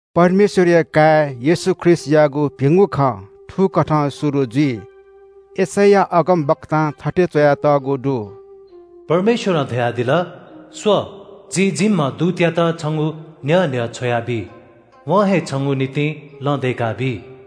परमेश्‍वरया काय् येशू ख्रीष्‍टयागु भिंगु खँ थुकथं शुरु जुइ। यशैया अगमवक्तां थथे च्‍वयातःगु दु – “परमेश्‍वरं धयादिल – ‘स्‍व, जिं जिम्‍ह दूतयात छंगु न्‍ह्यः न्‍ह्यः छ्वयाबी। वं हे छंगु निंतिं लँ दय्‌काबी।’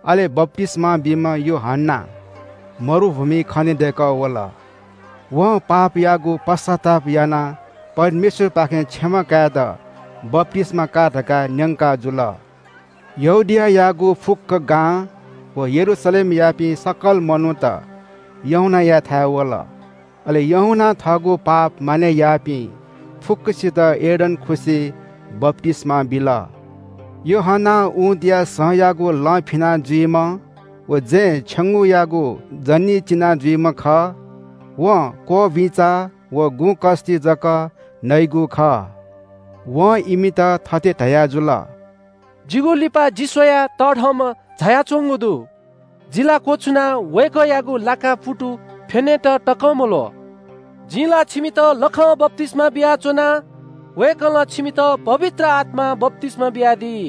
अले बप्‍तिस्‍मा बीम्‍ह यूहन्‍ना मरुभूमिइ खनेदय्‌कः वल। वं पापयागु पश्‍चाताप यानाः परमेश्‍वरपाखें क्षमा कायेत बप्‍तिस्‍मा का धकाः न्‍यंकाजुल। यहूदियायागु फुक्‍क गां व यरूशलेमयापिं सकल मनूत यूहन्‍नायाथाय् वल। अले यूहन्‍नां थःगु पाप मानय् याःपिं फुक्‍कसित यर्दन खुसिइ बप्‍तिस्‍मा बिल। यूहन्‍ना ऊँटया सँयागु लं फिनाजुइम्‍ह व जँय् छेंगूयागु जनी चिनाजुइम्‍ह खः। वं क्‍वःबुइँचा व गुँ कस्‍ति जक नइगु खः। वं इमित थथे धयाजुल – “जिगु लिपा जि स्‍वयाः तःधंम्‍ह झायाच्‍वंगु दु। जि ला क्‍वछुनाः वय्‌कःयागु लाकां पुतु फ्‍यनेत तकं मल्‍वः। जिं ला छिमित लखं बप्‍तिस्‍मा बियाच्‍वना। वय्‌कलं छिमित पवित्र आत्‍मां बप्‍तिस्‍मा बियादी।”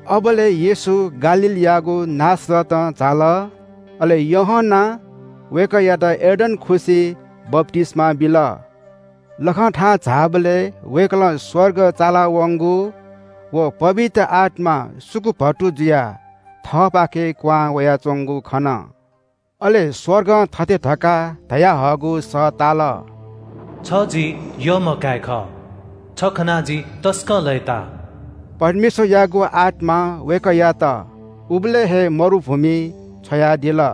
अबलय् येशू गालीलयागु नासरतं झाल, अले यूहन्‍नां वय्‌कःयात यर्दन खुसिइ बप्‍तिस्‍मा बिल। लखं थाहां झाःबलय् वय्‌कलं स्‍वर्ग चालावंगु व पवित्र आत्‍मा सुकुभतु जुयाः थःपाखे कुहां वयाच्‍वंगु खन। अले स्‍वर्गं थथे धकाः धयाहःगु सः ताल – “छ जि यःम्‍ह काय् खः। छ खनाः जि तसकं लय्‌ताः।” परमेश्‍वरयागु आत्‍मां वय्‌कःयात उबलय् हे मरुभूमिइ छ्वयादिल।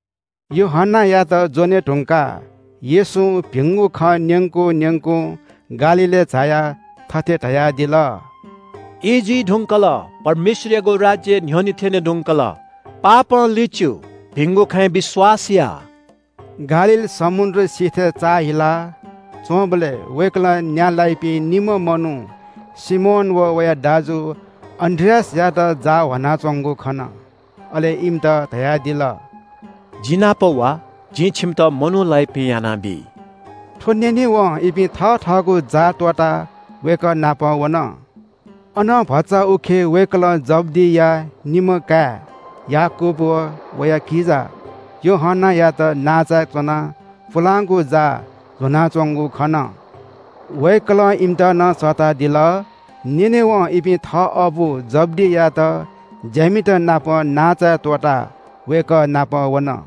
यूहन्‍नायात ज्‍वने धुंकाः येशूं भिंगु खँ न्‍यंकुं न्‍यंकुं गालीलय् झायाः थथे धयादिल – “ई जुइ धुंकल, परमेश्‍वरयागु राज्‍य न्‍ह्यःने थ्‍यने धुंकल। पश्‍चाताप या, भिंगु खँय् विश्‍वास या।” गालील समुद्र सिथय् चाःहिला च्‍वंबलय् वय्‌कलं न्‍या लाइपिं निम्‍ह मनू सिमोन व वया दाजु अन्‍द्रियासयात जाः ह्वानाच्‍वंगु खन। अले इमित धयादिल – “जि नाप वा, जिं छिमित मनू लाइपिं यानाबी।” थ्‍व न्‍यनेवं इपिं थथःगु जाः त्‍वःताः वय्‌कः नाप वन। अनं भचा उखे वय्‌कलं जब्‍दिया निम्‍ह काय् याकूब व वया किजा यूहन्‍नायात नांचाय् च्‍वनाः पुलांगु जाः ल्‍ह्वनाच्‍वंगु खन। वय्‌कलं इमित नं सःतादिल। न्‍यनेवं इपिं थः अबु जब्‍दीयात ज्‍यामितनापं नांचाय् त्‍वःताः वय्‌कः नाप वन।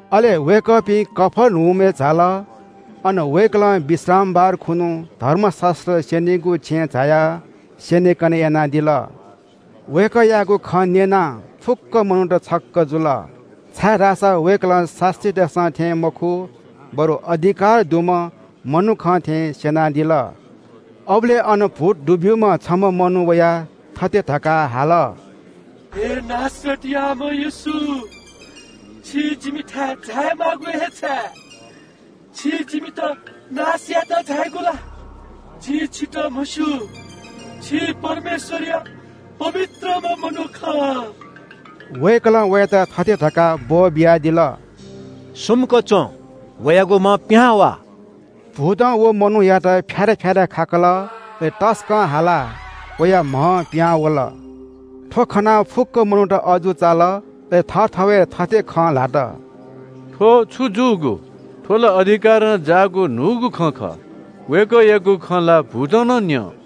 अले वय्‌कःपिं कफर्नहुमय् झाल। अन वय्‌कलं विश्रामबार खुन्‍हु धर्मशास्‍त्र स्‍यनीगु छेँय् झायाः स्‍यनेकने यानादिल। वय्‌कःयागु खँ न्‍यनाः फुक्‍क मनूत छक्‍क जुल। छाय्‌धाःसा वय्‌कलं शास्‍त्रीतय्‌सं थें मखु, बरु अधिकार दुम्‍ह मनुखं थें स्‍यनादिल। अबलय् अन भूत दुब्‍यूम्‍ह छम्‍ह मनू वयाः थथे धकाः हाल – “हे नासरतयाम्‍ह येशू, छि जिमिथाय् झायेमाःगु हे छाय्? छि जिमित नाश यायेत झायागु ला? जिं छितः म्‍हस्‍यू, छि परमेश्‍वरया पवित्रम्‍ह मनू खः।” वय्‌कलं वयात थथे धकाः ब्‍वःबियादिल – “सुम्‍क च्‍वँ। वयागु म्‍हं पिहां वा।” भूतं व मनूयात फ्‍यारा फ्‍यारा खाकल। अले तसकं हालाः वया म्‍हं पिहां वल। थ्‍व खनाः फुक्‍क मनूत अजू चाल। अले थःथवय् थथे खँ ल्‍हात – “थ्‍व छु जूगु? थ्‍व ला अधिकारं जाःगु न्‍हूगु खँ खः। वय्‌कःयागु खँ ला भूतं नं न्‍यं।”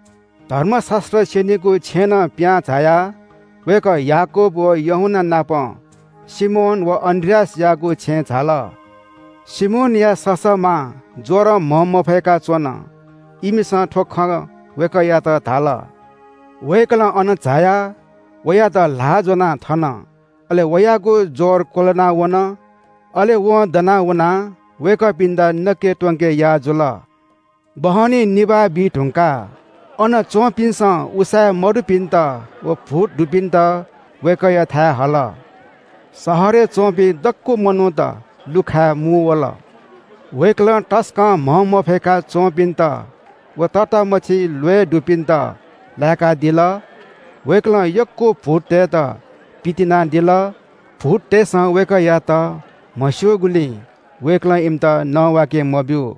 धर्मशास्‍त्र स्‍यनीगु छेँनं पिहां झायाः वय्‌कः याकूब व यूहन्‍ना नाप सिमोन व अन्‍द्रियासयागु छेँय् झाल। सिमोनया ससःमां ज्‍वरं म्‍हंमफय्‌का च्‍वन। इमिसं थ्‍व खँ वय्‌कःयात धाल। वय्‌कलं अन झायाः वयात ल्‍हाः ज्‍वनाः थन, अले वयागु ज्‍वर क्‍वलाना वन। अले वं दना वनाः वय्‌कःपिन्‍त नके त्‍वंके याः जुल। बहनी निभाः बीधुंकाः अन च्‍वंपिन्‍सं उसाँय् मदुपिन्‍त व भूत दुब्‍यूपिन्‍त वय्‌कःयाथाय् हल। शहरय् च्‍वंपिं दक्‍व मनूत लुखाय् मुंवल। वय्‌कलं तसकं म्‍हंमफय्‌का च्‍वंपिन्‍त व तःतामछि ल्‍वय् दुपिन्‍त लाय्‌कादिल। वय्‌कलं यक्‍व भूततय्‌त पितिनादिल। भूततय्‌सं वय्‌कःयात म्‍हस्‍यूगुलिं वय्‌कलं इमित नवाके मब्‍यू।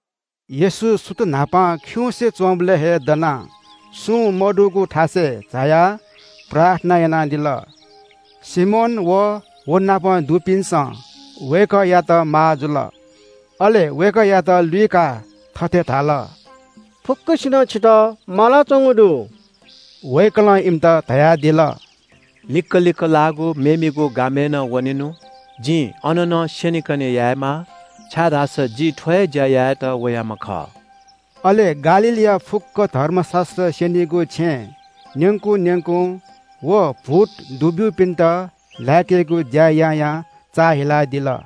येशू सुथ न्‍हापां खिउँसे च्‍वंबलय् हे दनाः सुं मदुगु थासय् झायाः प्रार्थना यानादिल। सिमोन अले वनापं दुपिन्‍सं वय्‌कःयात माः जुल। अले वय्‌कःयात लुइकाः थथे धाल – “फुक्‍कसिनं छितः मालाच्‍वंगु दु।” वय्‌कलं इमित धयादिल – “लिक्‍क लिक्‍क लाःगु मेमेगु गामय् नं वनेनु, जिं अन नं स्‍यनेकने यायेमाः, छाय्‌धाःसा जि थ्‍व हे ज्‍या यायेत वयाम्‍ह खः।” अले गालीलया फुक्‍क धर्मशास्‍त्र स्‍यनीगु छेँय् न्‍यंकु न्‍यंकुं व भूत दुब्‍यूपिन्‍त लाय्‌केगु ज्‍या यायां चाःहिलादिल।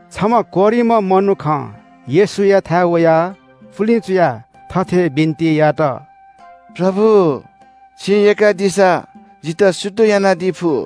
छम्‍ह कोह्रिम्‍ह मनुखं येशूयाथाय् वयाः पुलिं चुयाः थथे बिन्‍ति यात – “प्रभु, छिं यय्‌कादीसा जितः शुद्ध यानादी फु।”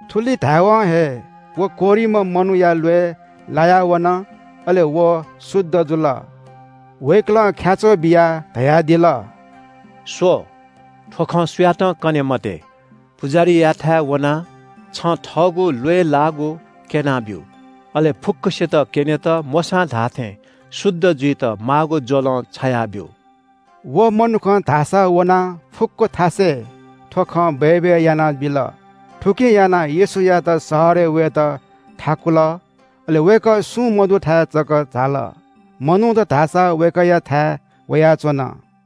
थुलि धाय्‌वं हे व कोह्रिम्‍ह मनूया ल्‍वय् लाया वन अले व शुद्ध जुल। वय्‌कलं ख्‍याच्‍वः बियाः धयादिल – “स्‍व, थ्‍व खँ सुयातं कनादी मते। पुजाहारीयाथाय् वनाः छं थःगु ल्‍वय् लाःगु क्‍यँ। अले फुक्‍कसित क्‍यनेत मोशां धाःथें शुद्ध जुइत माःगु ज्‍वलं छायाब्‍यु।” व मनुखं धाःसा वनाः फुक्‍क थासय् थ्‍व खँ बय्‌बय् यानाबिल। थुकिं यानाः येशूयात शहरय् वयेत थाकुल अले वय्‌कः सुं मदुथाय् च्‍वंझाल। मनूत धाःसा प्‍यखेरं वय्‌कःयाथाय् वयाच्‍वन।